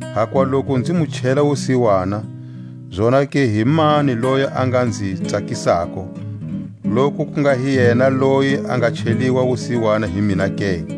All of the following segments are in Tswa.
Hakuva loku nzi mu chela wusiwana, zonake himani loyi a nga nzi tsakisako, loku ku nga hi yena loyi a nga cheliwa wusiwana hi mina ke?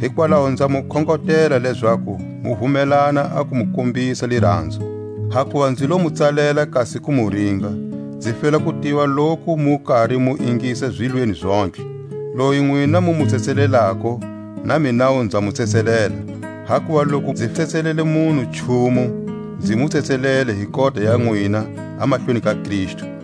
Hikwalaho nza mu khongotela lezaku mu vumelana a ku mu kombisa liranzo. Hakuva nzi lo mu tsalela kasi ku mu ringa, nzi fela ku tiva loku mu kari mu ingisa zilweni zontlhe. Loyi nwina mu mu tsetselelako, na minawu nza mu tsetselela; hakuva loku rizi tsetselele munhu nchumu, nzi mu tsetselele hi kota ya nwina a mahlweni ka Kristu,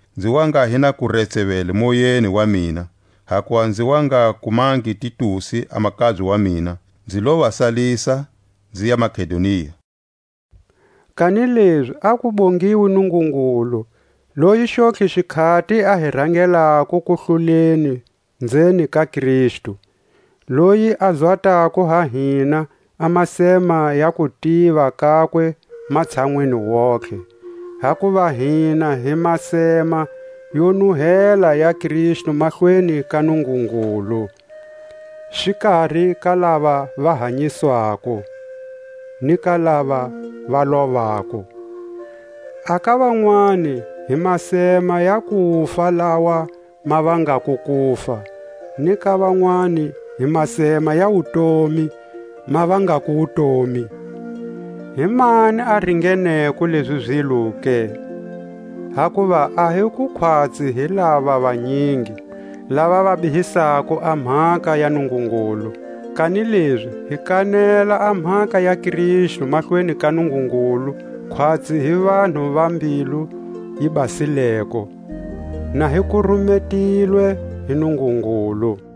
nzi wa nga hi na ku retsevele moyeni wa mina, hakuva nzi wa nga kumangi Titusi a makabye wa mina; nzi lo va salisa, nziya Makedonia. Kanilezi a ku bongiwe Nungungulu, loyi xontlhe xikhati a hi rangelako kuhluleni nzeni ka Kristu, loyi a zwatako ha hina a masema ya kutiva kakwe matshanwini wontihe. Hakuva hina hi masema yo nuhela ya Kristu mahlweni ka Nungungulu, xikari ka lava va hanyiswako ni ka lava va lovako. A ka vanwani hi masema ya kufa lawa ma vangako kufa, ni ka vanwani hi masema ya wutomi ma vangako wutomi. Himani a ringeneko lezi zilo ke? Hakuva a hi ku khwatsi hi lava vanyingi, lava va bihisako a mhaka ya Nungungulu; kanilezi hi kanela a mhaka ya Kristu Mahlweni ka Nungungulu khwatsi hi vanhu va mbilu yi basileko, na hi kurumetilwe hi Nungungulu.